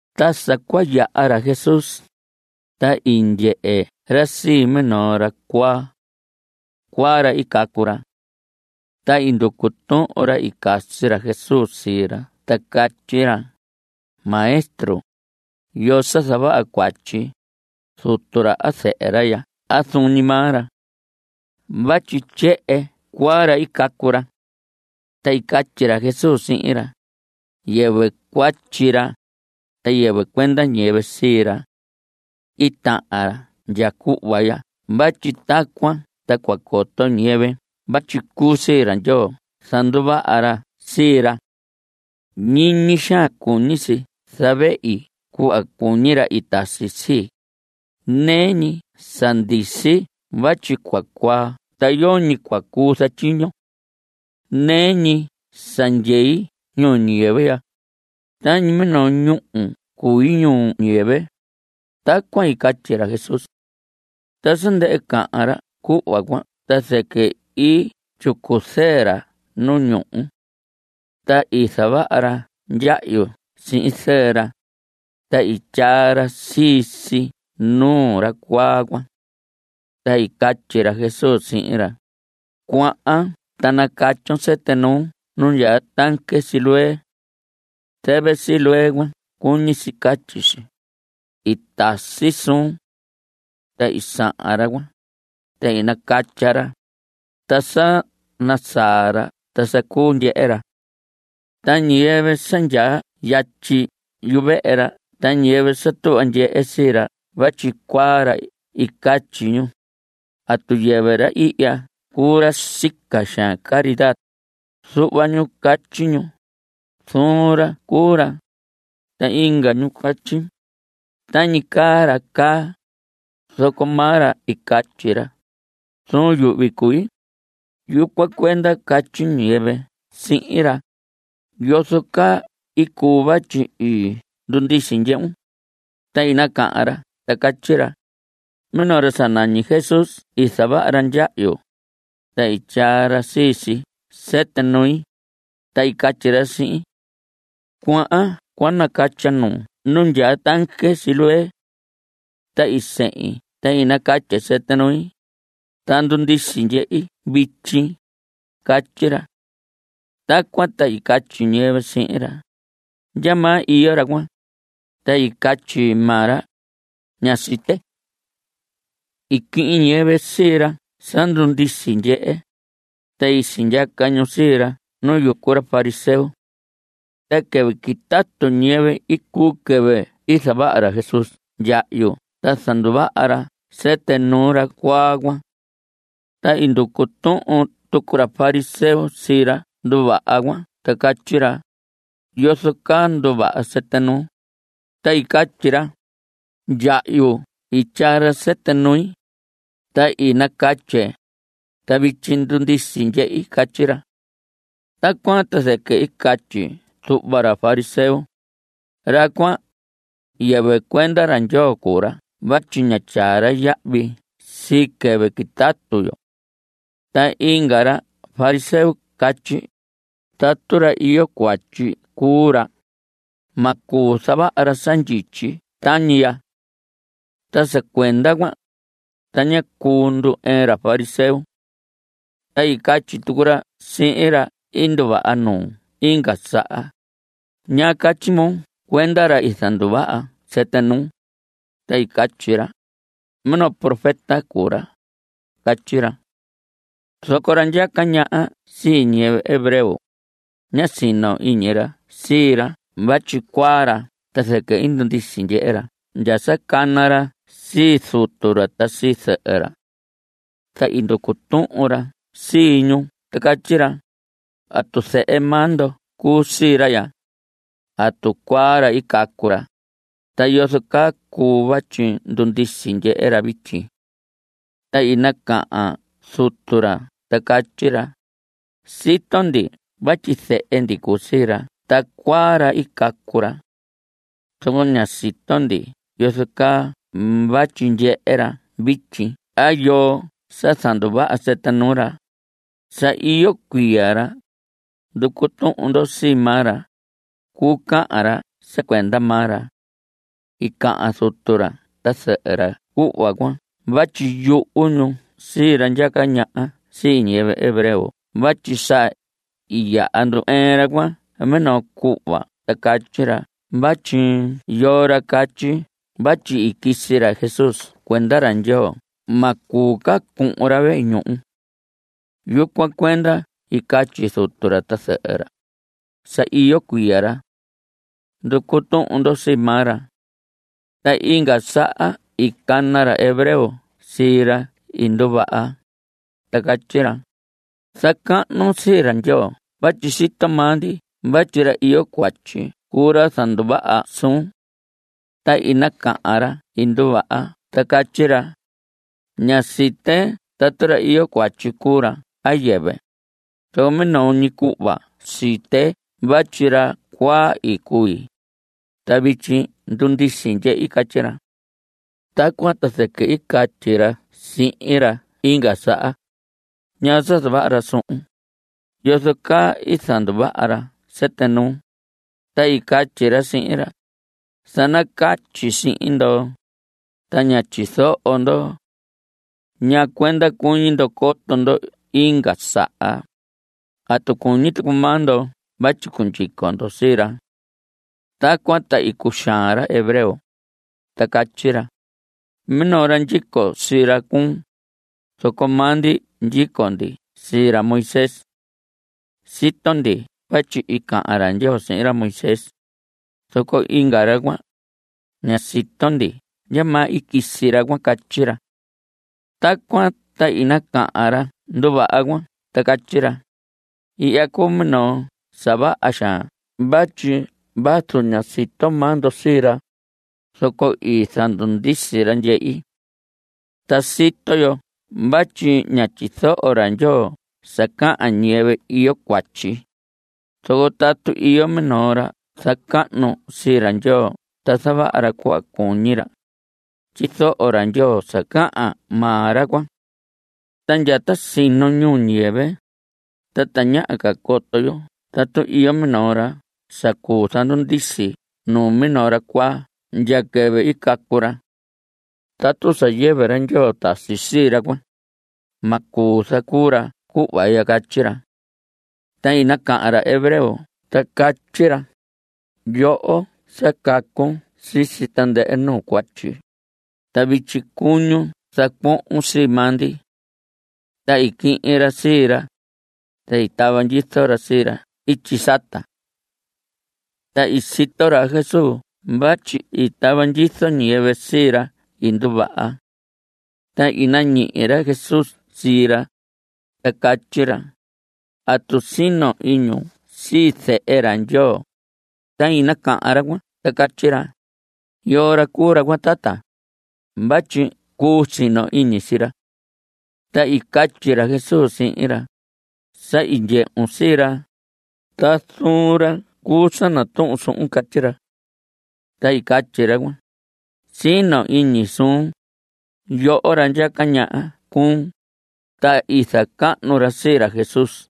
Ta sa cua yaha ra Jesús, ta i ndyehe ra sii minoo ra cuaa. Cuaa ra i cacu ra. Ta i nducu tuhun ra i casi ra Jesús sii ra ta catyi ra: Maestro, ¿yoo sa zavaha cuatyi, zutu ra a zɨhɨ ra ya a zuun ñi maa ra? Vatyi ndyehe, cuaa ra i cacu ra. Ta i catyi ra Jesús sihin ra: Yɨvɨ cuatyi ra, ta yɨvɨ cuenda ñiyɨvɨ sii ra. I tahan ra ya cuhva ya vatyi tacuan ta cua coto ñiyɨvɨ vatyi cuu sii ra Ndyoo zanduvaha ra sii ra. Ñiñi xaan cuñi si zavehi cuhva cuñi ra i tasi sii, nɨɨ ñi sa ndisi vatyi cua cuaa ta yoñi cua cuu zatyiño. Nɨɨ ñi sa ndyei ñuu ñiyɨvɨ ya, tañi minoo ñúhu cui ñuu ñiyɨvɨ. Tacuan i catyi ra Jesús. Ta sa ndɨhɨ cahan ra cuhva cuan ta zɨquɨ i tyicu zɨɨ ra nu ñuhu. Ta i zavaha ra ndyahyu sihin zɨɨ ra, ta i tyaa ra sii si nuu ra cuaa cuan. Ta i catyi ra Jesús sihin ra: Cuahan ta nacatyon sɨtɨ nuun nu ndyaa tanque Siloé. Zɨvɨ Siloé cuan cuñi si catyi si: I tasi suun. Ta i sahan ra cuan, ta i nacatya ra, ta sa nasaa ra ta sa cuu ndyehe ra. Ta ñiyɨvɨ sa ndyaa yatyi yuvehe ra ta ñiyɨvɨ sa tuhva ndyehe sii ra vatyi cuaa ra i catyi ñu: ¿Atu yɨvɨ ra ihya cuu ra sica xaan caridad? Zuhva ñu catyi ñu: Zuun ra cuu ra. Ta inga ñu catyi: Tañi caa ra caa. Zoco maa ra i catyi: Zuun yuhvi cui. Yucuan cuenda catyi ñiyɨvɨ sihin ra: ¿Yozo caa i cuu vatyi i ndundisi ndyehun? Ta i nacahan ra ta catyi ra: Minoo ra sa nañi Jesús i zavaha ra ndyahyu, ta i tyaa ra sii si sɨtɨ nui, ta i catyi ra sihin: “Cuahan cua nacatyon nuun nu ndyaa tanque Siloé.” Ta i sehin ta nacatye sɨtɨ nui, ta ndundisi ndyehi vityi. Catyi ra. Tacuan ta i catyi ñiyɨvɨ sihin ra: ¿Ndyamaa iyo ra cuan? Ta i catyi maa ra: Ña site. I quihin ñiyɨvɨ sii ra sa ndundisi ndyehe, ta sindyaca ñu sii ra nu yucu ra fariseo. Ta quɨvɨ quitatu ñiyɨvɨ i cuu quɨvɨ i zavaha ra Jesús ndyahyu ta zanduvaha ra sɨtɨ nuu ra cuaa cuan. Ta i nducu tuhun tucu ra fariseo sii ra nduvaha cuan ta catyi ra: ¿Yozo caa nduvaha sɨtɨ nuun? Ta i catyi ra: Ndyahyu i tyaa ra sɨtɨ nui, ta i nacatye, ta vityi ndundisi ndyehi. Catyi ra. Tacuan ta zɨquɨ i catyi zuhva ra fariseo: Ra cuan, yɨvɨ cuenda ra Ndyoo cuu ra vatyi ña tyaa ra yahvi sii quɨvɨ quitatu yo. Ta inga ra fariseo catyi: Tatu ra iyo cuatyi cuu ra, ma cuu zavaha ra sa ndyityi tañi ya. Ta sa cuenda cuan, ta ñá cuu ndu‑ɨɨn ra fariseo. Ta i catyi tucu ra sihin ra i nduvaha nuu inga saha: ¿Ñaa catyi moo cuenda ra i zanduvaha sɨtɨ nuun? Ta i catyi ra: Minoo ra profeta cuu ra. Catyi ra. Zoco ra ndyaca ñaha sii ñiyɨvɨ hebreo, ñá sino iñi ra sii ra vatyi cuaa ra ta zɨquɨ i ndundisi ndyehe ra ndya sa cana ra sii zutu ra ta sii zɨhɨ ra. Ta i nducu tuhun ra sii ñu ta catyi ra: ¿Atu zehe maa ndo cuu sii ra ya? ¿Atu cuaa ra i cacu ra? ¿Ta yozo caa cuu vatyi ndundisi ndyehe ra vityi? Ta i nacahan zutu ra ta catyi ra: Sito ndi vatyi zehe ndi cuu sii ra ta cuaa ra i cacu ra. Zoco ña sito ndi yozo caa vatyi ndyehe ra vityi a yoo sa zanduvaha sɨtɨ nuu ra. Sa iyo cuiya ra. Nducu tuhun ndo sii maa ra. Cuu cahan ra sa cuenda maa ra. I cahan zutu ra ta zɨhɨ ra cuhva cuan vatyi yuhu ñu sii ra ndyaca ñaha sii ñiyɨvɨ hebreo vatyi sa i yaha ndu‑ɨɨn ra cuan minoo cuhva ta catyi ra vatyi yoo ra catyi vatyi i quisi ra Jesús cuenda ra Ndyoo ma cuu ca cuhun ra vehe ñuhu. Yucuan cuenda i catyi zutu ra ta zɨhɨ ra: “Sa iyo cuiya ra. Nducu tuhun ndo sii maa ra.” Ta inga saha i cana ra hebreo sii ra i nduvaha, ta catyi ra: Zacahnun sii ra Ndyoo vatyi sito maa ndi vatyi ra iyo cuatyi cuu ra zanduvaha suun. Ta i nacahan ra i nduvaha ta catyi ra: Ña site tatu ra iyo cuatyi cuu ra a yɨvɨ, zoco minoo ñi cuhva site vatyi ra cuaa i cui, ta vityi ndundisi ndyehi. Catyi ra. Tacuan ta zɨquɨ i catyi ra sihin ra inga saha: ¿Ñaa sa zavaha ra suhun? ¿Yozo caa i zanduvaha ra sɨtɨ nuun? Ta i catyi ra sihin ra: Sa nacatyi sihin ndo, ta ñá tyizoho ndo. ¿Ñaa cuenda cuñi ndo coto ndo inga saha? ¿Atu cuñi tucu maa ndo vatyi cundyico ndo sii ra? Tacuan ta i cuxaan ra hebreo, ta catyi ra: Minoo ra ndyico sii ra cuun. Zoco maa ndi ndyico ndi sii ra Moisés. Sito ndi vatyi i cahan ra Ndyoo sihin ra Moisés. Zoco inga ra cuan, ña sito ndi ndyamaa i quisi ra cuan. Catyi ra. Tacuan ta i nacahan ra nduvaha cuan ta catyi ra: Ihya cuu minoo sa vaha xaan vatyi vazu ña sito maa ndo sii ra, zoco i zandundisi ra ndyehi. Ta sito yo vatyi ña tyizoho ra Ndyoo sa cahan ñiyɨvɨ iyo cuatyi. Zoco tatu iyo minoo ra zacahnu sii ra Ndyoo ta zavaha ra cuhva cuñi ra, tyizoho ra Ndyoo sa cahan maa ra cuan. Ta ndya ta sino ñuu ñiyɨvɨ, ta tañaha ca coto yo tatu iyo minoo ra sa cuu zandundisi nuu minoo ra cuaa ndya quɨvɨ i cacu ra. Tatu sa yɨvɨ ra Ndyoo tasi sii ra cuan, ma cuu zacuu ra cuhva ya. Catyi ra. Ta i nacahan ra hebreo ta catyi ra: Yoho sa cacun sisi tandɨhɨ nuu cuatyi, ta vityi cuñun zacuohon sii maa ndi. Ta i quihin ra sii ra, ta i tava ndyizo ra sii ra ityi sata. Ta i sito ra Jesús vatyi i tava ndyizo ñiyɨvɨ sii ra i nduvaha. Ta i nañihi ra Jesús sii ra, ta catyi ra: ¿Atu sino iñun sii Zehe ra Ndyoo? Ta i nacahan ra cuan ta catyi ra: ¿Yoo ra cuu ra cuan, tata? vatyi cuu sino iñi sii ra. Ta i catyi ra Jesús sihin ra: Sa i ndyehun sii ra, ta zuun ra cuu sa natuhun suhun. Catyi ra. Ta i catyi ra cuan: Sino iñi suun; yoho ra ndyaca ñaha cuun. Ta i zacahnu ra sii ra Jesús.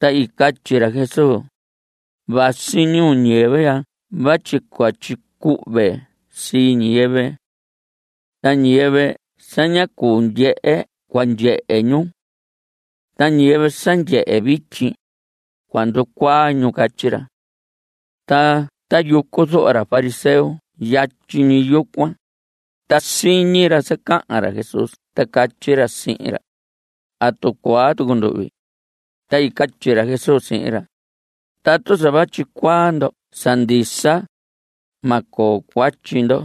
Ta i catyi ra Jesús: Vasi ñuu ñiyɨvɨ ya vatyi cua tyicuhve sii ñiyɨvɨ. Ta ñiyɨvɨ sa ña cuu ndyehe cua ndyehe ñu. Ta ñiyɨvɨ sa ndyehe vityi, cua nducuaa ñu. Catyi ra. Ta tayucu zuhva ra fariseo yatyi ñi yucuan, ta siñi ra sa cahan ra Jesús ta catyi ra sihin ra: ¿Atu cuaa tucu nduhvi? Ta i catyi ra Jesús sihin ra: Tatu sa vatyi cuaa ndo sa ndisa, ma coo cuatyi ndo.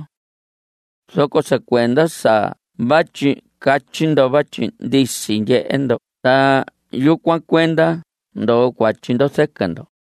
Zoco sa cuenda sa vatyi catyi ndo vatyi ndisi ndyehe ndo ta yucuan cuenda ndoo cuatyi ndo zɨquɨ ndo.